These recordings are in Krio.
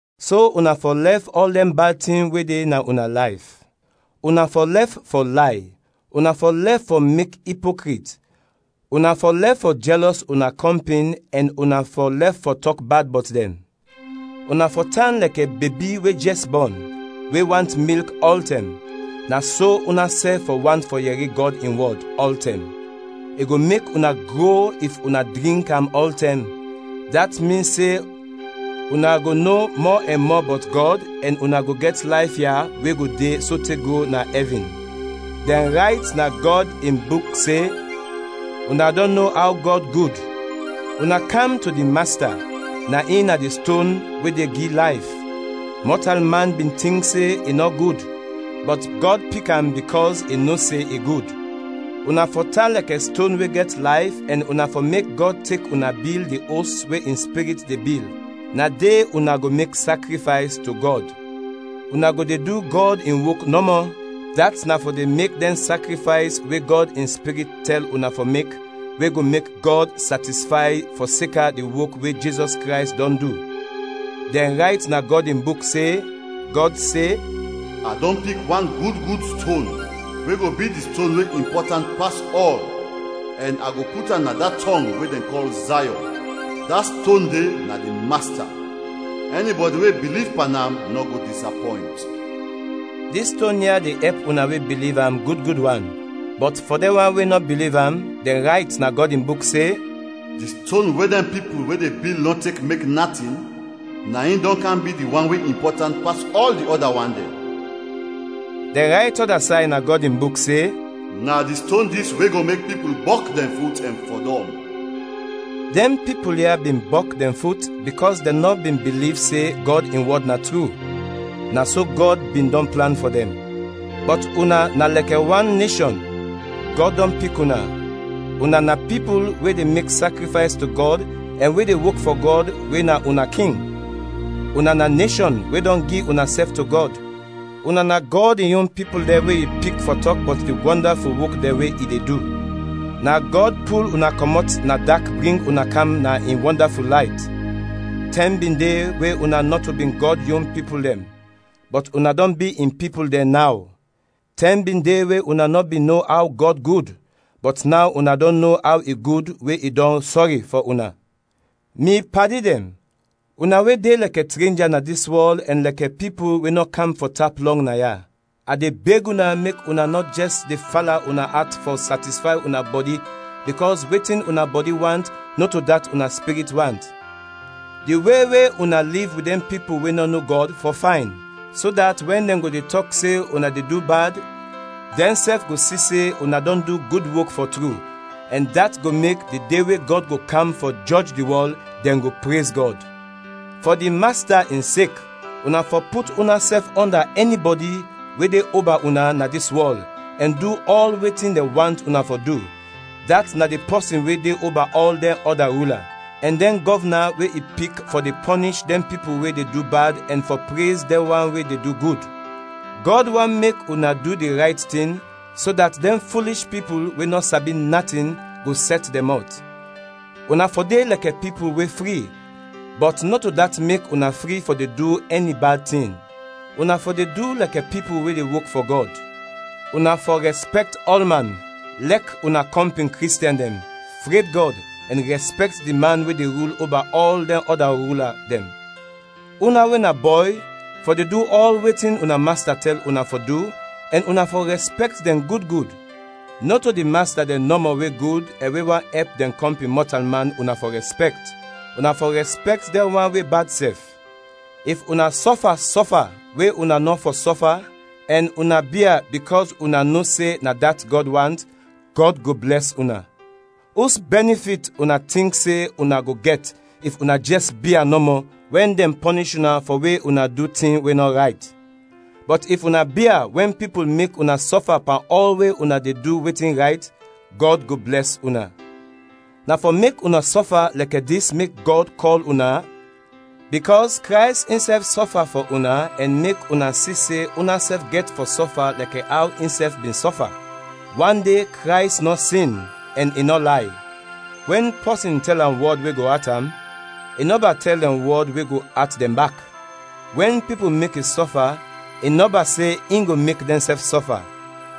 So una fɔ lɛf ɔl dɛn bad tin we de na una layf: una fɔ lɛf fɔ lay, una fɔ lɛf fɔ mek ipokrit, una fɔ lɛf fɔ jɛlɔs una kɔmpin ɛn una fɔ lɛf fɔ tɔk bad bɔt dɛn. Una fɔ tan lɛkɛ bebi we jɛs bɔn, we want milk ɔltɛm; na so unasɛf fɔ want fɔ yɛri Gɔd in wɔd, ɔltɛm; i go mek una gro if una drink am ɔltɛm, dat min se una go no mɔ ɛn mɔ bɔt Gɔd ɛn una go gɛt layf ya we go de sote go na ɛvin. Dɛn rayt na Gɔd in Buk se, “Una dɔn no aw Gɔd gud.” Una kam to di Masta, na in na di ston we de gi layf; mɔtalman bin tink se i nɔ gud, bɔt Gɔd pik am bikɔs i no se i gud. Una fɔ tan lɛkɛ ston we gɛt layf ɛn una fɔ mek Gɔd tek una bil di os we in Spirit de bil, na de una go mek sakrifays to Gɔd. Una go de du Gɔd in wok nɔmɔ, dat na fɔ de mek dɛn sakrifays we Gɔd in Spirit tɛl una fɔ mek, we go mek Gɔd satisfay fɔseka di wok we Jizɔs Krays dɔn du. Dɛn rayt na Gɔd in Buk se, Gɔd se, “A dɔn pik wan gud gud ston we go bi di ston we impɔtant pas ɔl ɛn a go put am na da tɔng we dɛn kɔl Zayɔn; da ston de na di Masta; ɛnibɔdi we biliv pan am nɔ go disapɔynt.” Dis ston ya de ɛp una we biliv am gud gud wan, bɔt fɔ dɛn wan we nɔ biliv am, dɛn rayt na Gɔd in Buk se, “Di ston we dɛn pipul we de bil nɔ tek mek natin, na in dɔn kam bi di wan we impɔtant pas ɔl di ɔda wan dɛn.” Dɛn rayt ɔda say na Gɔd in Buk se, “Na di ston dis we go mek pipul bɔk dɛn fut ɛn fɔdɔm.” Dɛn pipul ya bin bɔk dɛn fut bikɔs dɛn nɔ bin biliv se Gɔd in wɔd na tru; na so Gɔd bin dɔn plan fɔ dɛn. Bɔt una na lɛkɛ wan neshɔn, Gɔd dɔn pik una, una na pipul we de mek sakrifays to Gɔd ɛn we de wok fɔ Gɔd we na una King; una na neshɔn we dɔn gi unasɛf to Gɔd, una na Gɔd in yon pipul dɛn we i pik fɔ tɔk bɔt di wɔndaful wok dɛn we i de du. Na Gɔd pul una kɔmɔt na dak bring una kam na in wɔndaful layt. Tɛm bin de we una nɔto bin Gɔd yon pipul dɛn, bɔt una dɔn bi in pipul dɛn naw; tɛm bin de we una nɔ bin no aw Gɔd gud, bɔt naw una dɔn no aw i gud we i dɔn sɔri fɔ una. Mi padi dɛn, una we de lɛkɛ trenja na dis wɔl ɛn lɛkɛ pipul we nɔ kam fɔ tap lɔng naya, a de beg una mek una nɔ jɛs de fala una at fɔ satisfay una bɔdi bikɔs wetin una bɔdi want nɔto dat una spirit want. Di we we una liv wit dɛn pipul we nɔ no Gɔd fɔ fayn, so dat wɛn dɛn go de tɔk se una de du bad, dɛnsɛf go si se una dɔn du gud wok, fɔ tru, ɛn dat go mek, di de we Gɔd go kam fɔ jɔj di wɔl, dɛn go prez Gɔd. Fɔ di Masta in sek, una fɔ put unasɛf ɔnda ɛnibɔdi we de oba una na dis wɔl ɛn du ɔl wetin dɛn want una fɔ du, dat na di pɔsin we de oba ɔl dɛn ɔda rula, ɛn dɛn gɔvna we i pik fɔ de pɔnish dɛn pipul we de du bad ɛn fɔ prez dɛn wan we de du gud. Gɔd want mek una du di rayt tin, so dat dɛn fulish pipul we nɔ sabi natin go sɛt dɛn mɔt. Una fɔ de lɛkɛ pipul we fri, bɔt nɔto dat mek una fri fɔ de du ɛni bad tin. Una fɔ de du lɛkɛ pipul we de wok fɔ Gɔd. Una fɔ rɛspɛkt ɔlman, lɛk una kɔmpin Kristiɛn dɛn, fred Gɔd, ɛn rɛspɛkt di man we de rul oba ɔl dɛn ɔda rula dɛn. Una we na bɔy fɔ de du ɔl wetin una masta tɛl una fɔ du ɛn una fɔ rɛspɛkt dɛn gud gud; nɔto di masta dɛn nɔmɔ we gud ɛn we want ɛp dɛn kɔmpin mɔtalman una fɔ rɛspɛkt, una fɔ rɛspɛkt dɛn wan we bad sɛf. If una sɔfa sɔfa we una nɔ fɔ sɔfa ɛn una bia bikɔs una no se na dat Gɔd want, Gɔd go blɛs una. Us bɛnifit una tink se una go gɛt if una jɛs bia nɔmɔ wɛn dɛn pɔnish una fɔ we una du tin we nɔ rayt? Bɔt if una bia wɛn pipul mek una sɔfa pan ɔl we una de du wetin rayt, Gɔd go blɛs una. Na fɔ mek una sɔfa lɛkɛ dis mek Gɔd kɔl una, bikɔs Krays insɛf sɔfa fɔ una ɛn mek una si se unasɛf gɛt fɔ sɔfa lɛkɛ aw insɛf bin sɔfa. Wande Krays nɔ sin, ɛn i nɔ lay. Wɛn pɔsin tɛl am wɔd we go at am, i nɔba tɛl dɛn wɔd we go at dɛn bak; wɛn pipul mek i sɔfa, i nɔba se in go mek dɛnsɛf sɔfa,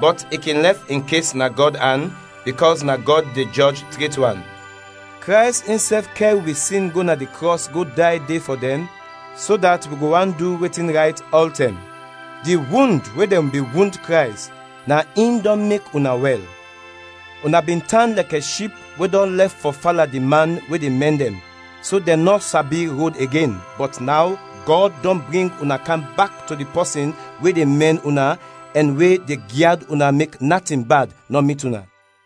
bɔt i kin lɛf in kes na Gɔd an, bikɔs na Gɔd de jɔj tret wan. Krays insɛf kɛr wi sin go na di krɔs go day de fɔ dɛn, so dat wi go want du wetin rayt ɔltɛm. Di wund we dɛn bin wund Krays na in dɔn mek una wɛl. Una bin tan lɛkɛ ship we dɔn lɛf fɔ fala di man we de mɛn dɛn, so dɛn nɔ sabi rod igen, bɔt naw Gɔd dɔn bring una kam bak to di pɔsin we de mɛn una ɛn we de gyad una mek natin bad nɔ mit una.